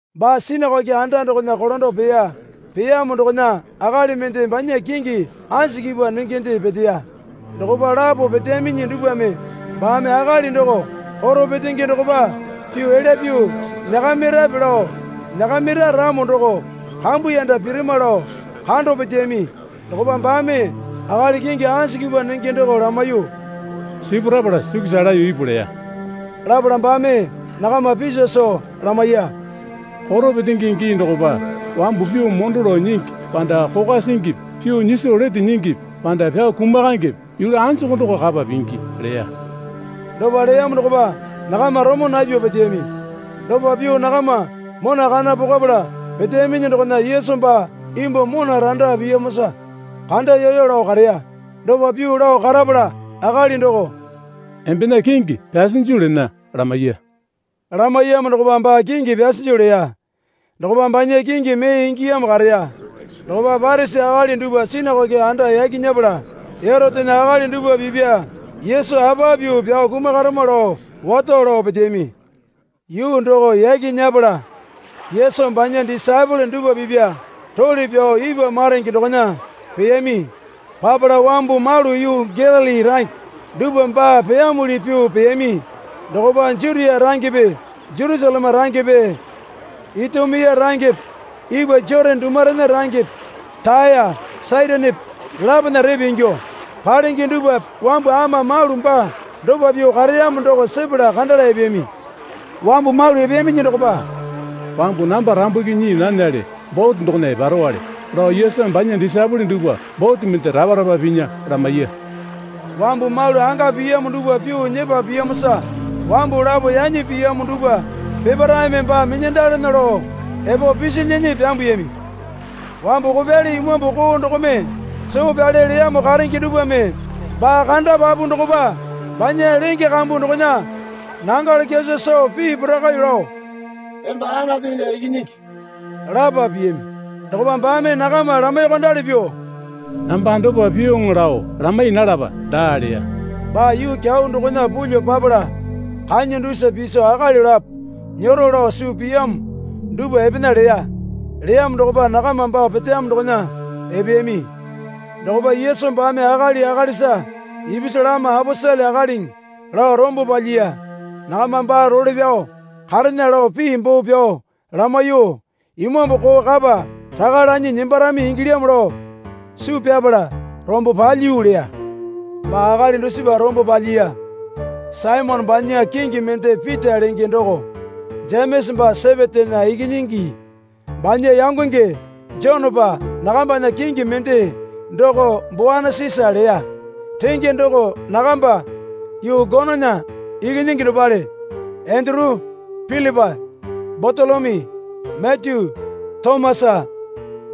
Baa sinakoke anda dokona kolando peya. Peyamo dokona akali mende banya kingi anjukipa nengende peteya. Dokopa lapo peteyaminyi dupwame baame akali doko koro petenge dokopa pyuo elya pyuo nyakamirape lao nyakamira ramo doko kambuyanda pirama lao kando peteyami. Dokopa baame akali kingi anjukipa nenge doko lamaiyuo, Sipurapala sukusa laeyo ipu, leya. Lapala baame nakama piso soo lamaiya. Koro petenge gii dokopa wambu pyuo mondo lao nyingi panda kokwa singipi pyuo nyiso lete nyingipi panda pyao kumakaengepe yulu anjuku doko kapa pingi? leya. Dopa leyamo dokopa nakama romo napyuo peteyami. Dopa pyuo nakama mona kana pokwapala peteyaminyi dokona Yesu baa imbuo mona randa piyamosa kandayoyo lao kareya. Dopa pyuo lao karapala akali doko, Embena kingi pyasinju lena, lamaiya. Lamaiyamo dokopa baa kingi pyasinju leya. Dokopa banya kingi mee ingiyamo kareya. Dokopa Parisi akali dupwa sinakoke anda yaki nyepala Erotena akali dupwa pipya Yesu apa pyuo pyao kumakarama lao wato lao peteyami. Yuu doko yaki nyepala, Yesu banya disaepole dupwa pipya role pyao ipwa maronge dokona peyami. Papala wambu malu yuu Galili range dupwa baa peyamuli pyuo peyami. Dokopa Jutia rangepe Jerusaleme rangepe Itumia rangepe ipwa Jotane dumurena rangepe Taya Saitonepe dolapona repe ingyuo palenge dupwape wambu ama malu baa dopa pyuo kareyamo doko sepala kandala epeyami. Wambu malu epeyaminyi dokopa, Wambu namba rambuki nyii nanale bote dokona eparowale, lao Yesumi banya disaepole dupwa bote mende rapa rapa pinya lamaiya. Wambu malu anga piyamo dupwa pyuo nyepa piyamosa wambu lapo yanyi piyamo dupwa peparaeme baa minyandalana lao epo pisilyinyi pyambuyami. Wambu kopyali imambu koo dokome soo pyale leyamo karenge dupwame baa kandapapu dokopa banya lenge kambu dokona nangalo kyaso soo pii porakaiyuo lao, Emba Anatunya Ikinyingi, lapo piyami. Dokopa baame nakama lamaiyuokondali pyuo, Namba dopa pyuoŋo lao lamai nalapa, daa leya. Baa yuu kyau dokona pulyuo papala kanya dusa piso akali lapo nyero lao suu piyamo dupwa epena leya. Leyamo dokopa nakama baa peteyamo dokona epeyami. Dokopa Yesu baame akali akalisa ipisu lama aposele akaliŋi lao rombo palyiya. Nakama baa role pyao karena lao pii boo pyao lamaiyuo, imambu koo kapa raka lanyi nembarami ingilyamo lao suu pyapala rombo palyiyu leya. Baa akali dusipa rombo palyiya. Saimone banya kingi mende Pita lenge doko. Jemesa baa Sepetena ikinyingi banya yangonge Jonepa (Nakambana kingi mende doko Boanesisa leya. Renge doko nakamba Yuu Gonona Ikinyingi dopale.) Enduru, Pilipa, Batolomyu, Matyu, Tomasa,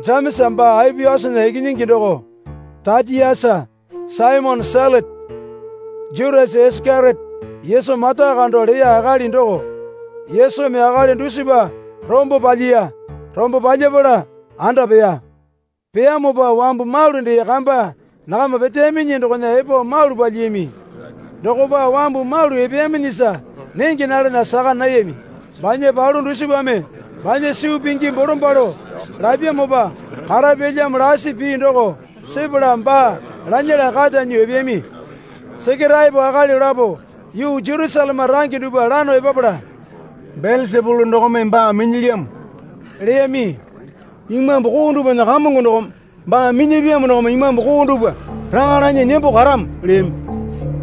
Jemesa baa Aopiasana ikinyingi doko, Tatiasa, Saimone Selote, Jutasa Isakeriote Yesu mata kando leya akali doko. Yesumi akali dusipa rombo palyiya. Rombo palyapala anda peya. Peyamopa wambu malu dee kamba nakama peteyaminyi dokona epo malu palyiyami. Dokopa wambu malu epeyaminyisa nenge nalana saka nayami. Banya palu dusipame banya suu pingi bolombalo lapyamopa karapyalyamo lasi pii doko sepala baa lanyala kata nyuo epeyami. Sekeraepo akali lapo yuu Jerusaleme range dupwa lano epapala, Belesapulu dokome baa minyilyamo, leyami. Imambu koo dupwana kamongo dokome baa minyapyamo dokome imambu koo dupwa raka lanyi nembo karamo, leyami.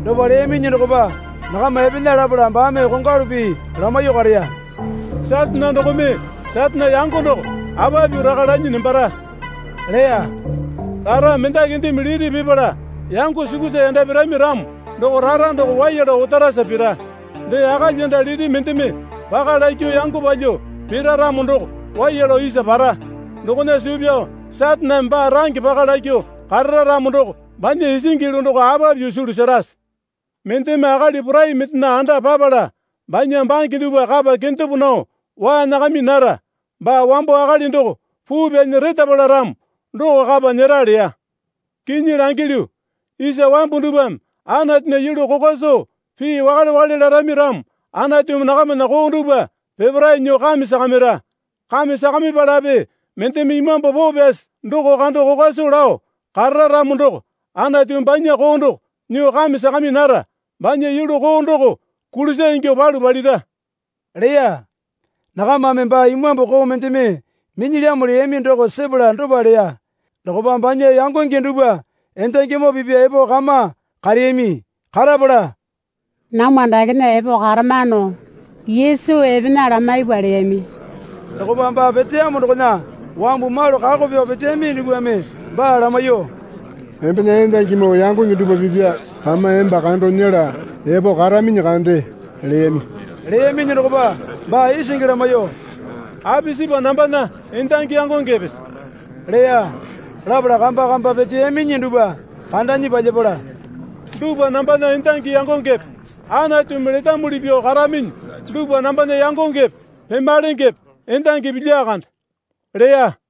Dopa leyaminyi dokopa nakama epena lapala baame kongwalu pii lamaiyuo kareya. Satane dokome Satane yango doko apa pyuo raka lanyi nembara? leya. Rara mendakindeme liti pipala yango sukusa yanda pirami ramo doko rara doko waiya lao otarasa pira. Dee akalyanda liti mendeme paka lakyuo yango palyuo pira ramo doko waiya lao isa para. Dokona suu pyao Sataneme baa range paka lakyuo karara ramo doko banya isingi yulu doko apa pyuo sulu serase? Mendeme akali porai mendena anda papala banya bange dupwa kapa kendepo nao waa nyakami nara. Baa wambo akali doko puu pyanyi retapala ramo doko kapa nyera, leya. Kinyi langilyu, isa wambu dupwame Anatunya yulu kokwa soo pii wakale wakale larami ramo Anatumi nakamana koo dupwa peparae nyuo kame sakamira. Kame sakamipalape mendeme Imambu Poo Pyasi doko kando kokwa soo lao karara ramo doko Anatumi banya koo doko nyuo kame sakami nara. Banya yulu koo doko kulisa ingyuo palu palira, leya. (Nakamame, Baa imambu koo mendeme minyilyamo, leyami doko sepala dopa leya.) Dokopa banya yangonge dupwa endangimoo pipwa epo kama kareyami. Karapala, Namwa dakena epo karamano Yesu epena lamaipwa, leyami. Dokopa baa peteyamo dokona wambu malu kako pyao peteyami dupwame baa lamaiyuo, Embena endangimoo yangonge dupwa pipya kama emba kando nyela epo karaminyi kande, leyami. Leyaminyi dokopa baa isingi lamaiyuo, Apisipa nambana endangi yangongepese? leya. Lapala kamba kamba peteyaminyi dupwa kandanyi palyapala, Dupwa nambana endangi yangongepe. Anatumi letamuli pyuo karaminyi dupwa nambana yangongepe pemalengepe endangipi lyakande, leya.